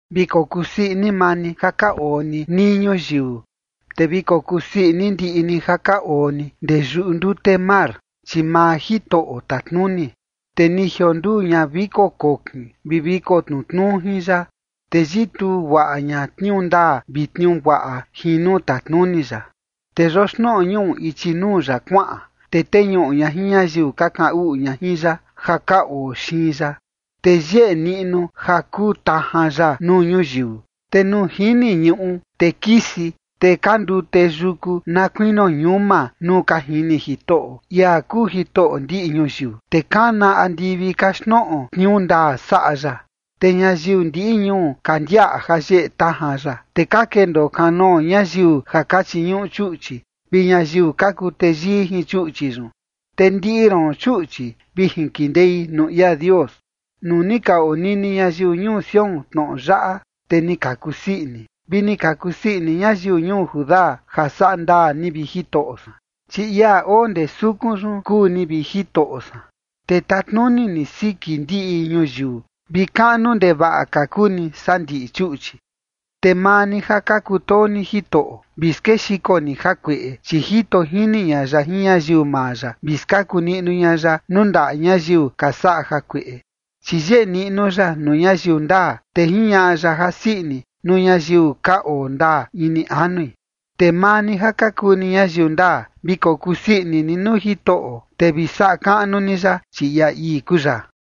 Vi kokuu sii ini maa ni ja ka oo ni nii ñuyiu, te vi kokusii ini ndiꞌi ni ja ka oo ni ndee yuꞌu ndute mar, chi maa Jitoꞌo tatnuni. Te ni jionduu ña viko kokin vi viko tnutnuu jin ya, te yituu guaꞌa ña tniuu ndaa vi tniuu guaꞌa jin nuu tatnuni ya. Te yoxnoꞌo ñuꞌu ichi nuu ya kuaꞌan, te teñuꞌu ña jin ñayiu ka kaꞌan uꞌu ña jin ya, ja ka oo xiin ya. Te yeꞌe niꞌnu ja kuun tajan ya nuu ñuyiu, te nuu jini ñuꞌu, te kisi. Te ka ndute yuku na kuinio ñuma nuu ka jini Jitoꞌo, ia kuu Jitoꞌo ndiꞌi ñuyiu. Te kana andivi kaxtnoꞌo tniuu ndaa saꞌa ya, te ñayiu ndiꞌi ñuu ka ndiaꞌa ja yeꞌe tajan ya. Te ka kendoo kanoo ñayiu ja ka chiñuꞌu chuꞌchi, vi ñayiu ka kuu teyii jin chuꞌchi yun. Te ndiꞌi roon, chuꞌchi, vi jinkindei nuu ia Dios. Nuu ni ka onini ñayiu yuku Sión tnoꞌo yaꞌa, te ni ka kusii ini, vi ni ka kusii ini ñayiu ñuu Judá ja saꞌa ndaa ni, vi Jitoꞌo san. Chi ia oo ndee sukun yun kuu ni, vi Jitoꞌo san, te tatnuni ni siki ndiꞌi ñuyiu, vi kaꞌnu ndevaꞌa ka kuu ni saa ndiꞌi chuꞌchi. Te maa ni ja ka kutoo ni Jitoꞌo, vi skexiko ni jakueꞌe, chi jito jini ña ya jin ñayiu maa ya, vi skaku niꞌnu ña ya nuu ndaꞌa ñayiu ka saꞌa jakueꞌe. Chi yeꞌe niꞌnu ya nuu ñayiu ndaa, te jiñaꞌa ya jasii ini nuu ñayiu ka oo ndaa ini anui. Te maa ni ja ka kuu ni ñayiu ndaa, vi kokusii ini ni nuu Jitoꞌo, te vi saꞌa kaꞌnu ni ya, chi ia ii kuu ya.